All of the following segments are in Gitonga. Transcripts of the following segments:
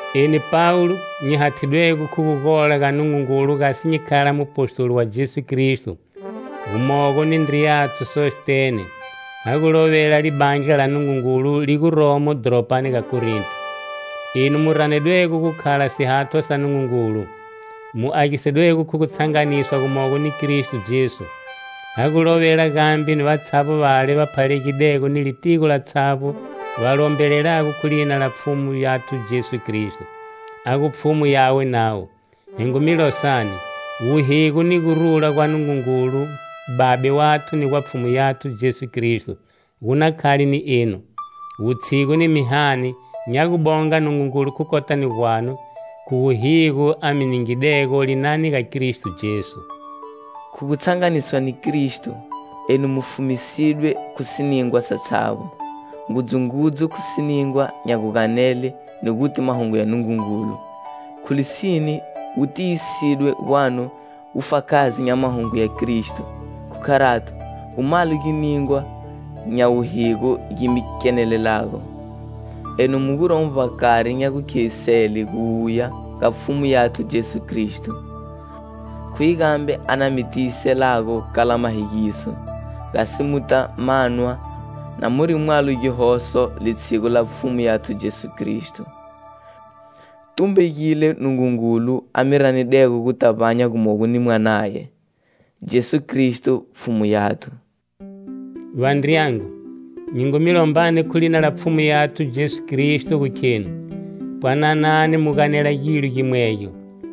Eni Pawulo, nyi hathidwego khu gugola ga Nungungulu gasi nyi khala mupostoli wa Jesu Kristo, gumogo ni ndriyathu Sostene, ha gu lovela Libandla la Nungungulu li guromo dhoropani ga Korinto, enu mu ranedwego gu khala sihathwa sa Nungungulu, mu agisidwego khu gutshanganiswa gumogo ni Kristo Jesu. Ha gu lovela gambe ni vatshavbo vale va phalalegidego ni litigo latshavbo va lombelelago khu lina la Pfhumu yathu Jesu Kristo, a gu Pfhumu yawe navo. Hi ngu mi losani. Wuhigo ni gurula gwa Nungungulu, Babe wathu ni gwa Pfhumu yathu Jesu Kristo gu na khale ni enu. Wutshigu ni mihani nya gubonga Nungungulu khu kotani gwanu, khu wuhigo a mi ningidego linani ga Kristo Jesu. Khu gutshanganiswa ni Kristo, enu mu fumisidwe khu siningwa satshavbo, ngudzungudzu khu siningwa nya guganele ni guti mahungu ya Nungungulu. Khu lisine, wu tiyisidwe gwanu wufakazi nya mahungu ya Kristo, khu kharato, gu mwalo giningwa nya wuhigo gi mi kenelelago, enu mu guromo vbakari nya gukhevisele guwuya ga Pfhumu yathu Jesu Kristo. Khuye gambe a na mi tiyiselago kala mahegiso, gasi muta manwa na muri mwalo gihoso litshiguni la Pfhumu yathu Jesu Kristo. Tumbegile Nungungulu a mi ranidego guta vbanya gumogo ni Mwanaye, Jesu Kristo, Pfhumu yathu. Vandriyangu, nyi ngu mi lombani khu lina la Pfhumu yathu Jesu Kristo gu kheni: Pwananani, mu ganela gilo gimwegyo;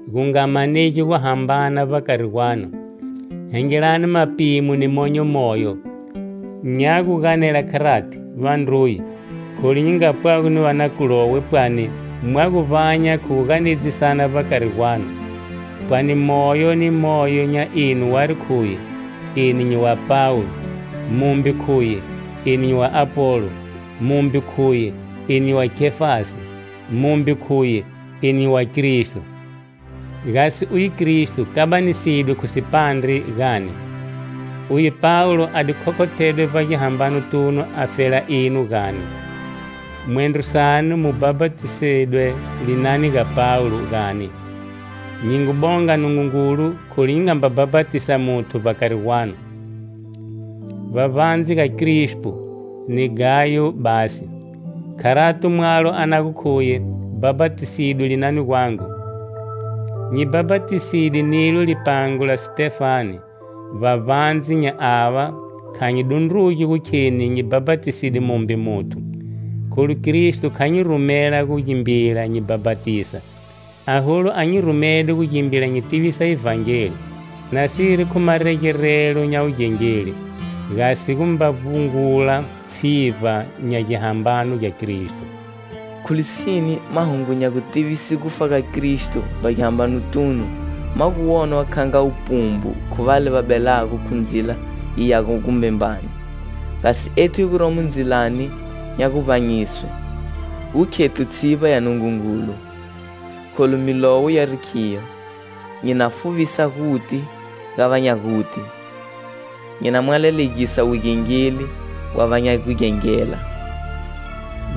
gu nga manegi guhambana vbakari gwanu; hengelani mapimo ni monyo moyo. Nya gu ganela kharati, vandruye, kholu nyi ngapwago ni va na Klowe pwani mwa gu vbanya khu gu ganedzisana vbakari gwanu. Pwani moyo ni moyo nya enu wari khuye: "Eni nyi wa Pawulo!" Mumbe khuye: "Eni nyi wa Apolo!". Mumbe khuye: "Eni nyi wa Kefasi!". Mumbe khuye: "Eni nyi wa Kristo!". Gasi uye Kristo kabanisedwe khu sipandre, gani? Uye Pawulo a di khokhothedwe vbagihambanotunu afela enu, gani? Mwendro sanu mu bhapatisidwe linani ga Pawulo, gani? Nyi ngu bonga Nungungulu kholu nyi nga mba bhapatisa muthu vbakari gwanu, vbavbandze ga Krispo ni Gayo basi. Kharato, mwalo a na gu khuye bhapatisidwe linani gwangu. Nyi bhapatiside nilo lipango la Sitefane, vbavbandze nya ava, kha nyi dundrugi gu kheni nyi bhapatiside mumbe muthu. Kholu Kristo kha nyi rumela gu gimbila nyi bhapatisa, aholu a nyi rumede gu gimbila nyi tivisa Ivhangeli, nasiri khu maregerelo nya wugengeli, gasi gumba vbungula tshivba nya gihambano gya Kristo. Khu lisine, mahungu nya gutivise gufa ga Kristo vbagihambanotunu ma gu wonwa kha nga wupumbu khu vale va belago khu ndzila yi yago gumbembani; gasi ethu hi guromo ndzilani nya guvbanyiswe, gu khethu tshivba ya Nungungulu. Kholu Milowo yari khiyo: "Nyi na fuvisa guti ga va nya guti,nyi na mwalalegisa wugengeli wa va nya gugengela"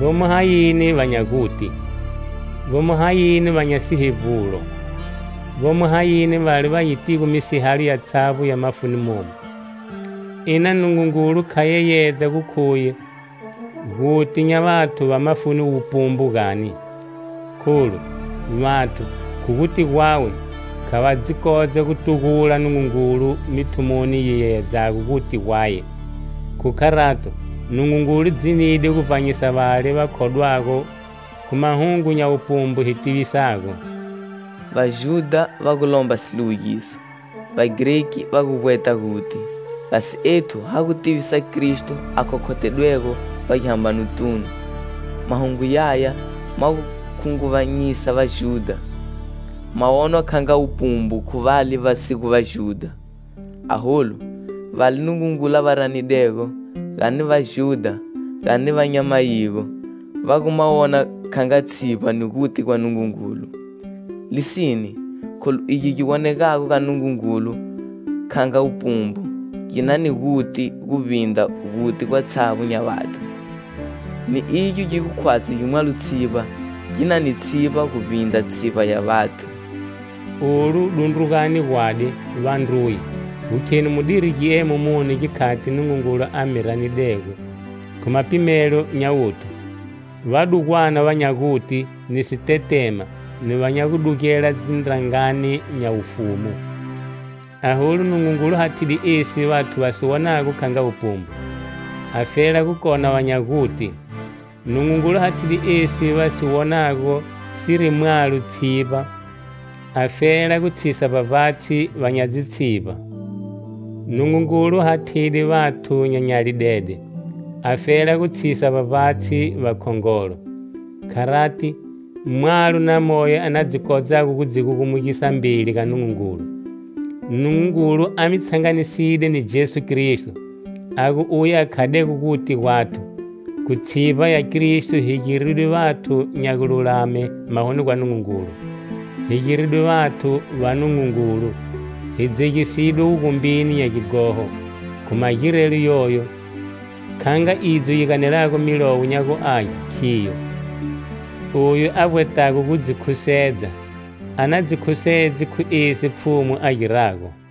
Vomo hayini va nya guti? Vomo hayini va nya sihevbulo? Vomo hayini vale va yitigo misihalo yatshavbo ya mafuni momu? Ina Nungungulu kha yeyedza gu khuye guti nya vathu va mafuni wupumbu gani? Kholu, vathu, khu guti gwawe, kha va dzi kodza gutugula Nungungulu mithumoni yi yeyedzago guti gwaye. Khu kharato, Nungungulu dzinide gu vbanyisa vale va khodwago khu mahungu nya wupumbu hi tivisago. Vajudha va gu lomba siliwugiso, Vagreki va gu vbweta guti. Gasi ethu ha gu tivisa Kristo a khokhothedwego vbagihambanotunu. Mahungu yaya ma gu khunguvanyisa Vajudha, ma wonwa kha nga wupumbu khu vale va si gu Vajudha. Aholu, vale Nungungulu a va ranidego, gani Vajudha gani va nya mayigo, va gu ma wona kha nga tshivba ni guti gwa Nungungulu. Lisine, kholu egi gi wonegago ga Nungungulu kha nga wupumbu, gi na ni guti guvbindra guti gwatshavbo nya vathu, ni igyo gi gu khwatshi gi mwalo tshivba gi na ni tshivba guvbindra tshivba nya vathu. Olu dundrugani gwadi, vandruye, gu khenu mudiri giemo muni gikhati Nungungulu a mi ranidego. Khu mapimelo nya wuthu, vadugwana va nya guti, ni sitetema, ni va nya gudugela dzindrangani nya wufumu. Aholu, Nungungulu hathide esi vathu va si wonago kha nga wupumbu, afela gu kona va nya guti; Nungungulu hathide esi vathu va si wonago siri mwalo tshivba afela gu tshisa vbavbatshi va nya dzitshivba. Nungungulu hathide vathu nya nyalidede afela gu tshisa vbavbatshi vakhongolo. Kharati, mwalo na moyo a na dzi kodzago gu dzi gugumugisa mbeli ga Nungungulu. Nungungulu a mi tshanganiside ni Jesu Kristo, a gu uye a khadego guti gwathu. Khu tshivba ya Kristo hi giridwe vathu nya gululame mahoni gwa Nungungulu, hi giridwe vathu va Nungungulu, hi dzegisidwe wugumbini nya gighoho. Khu magirelo yoyo, kha nga idzo yi ganelago Milowo nya gu Age khiyo: "Oyu a vbwetago gu dzi khusedza,a na dzi khusedze khu esi Pfhumu a girago."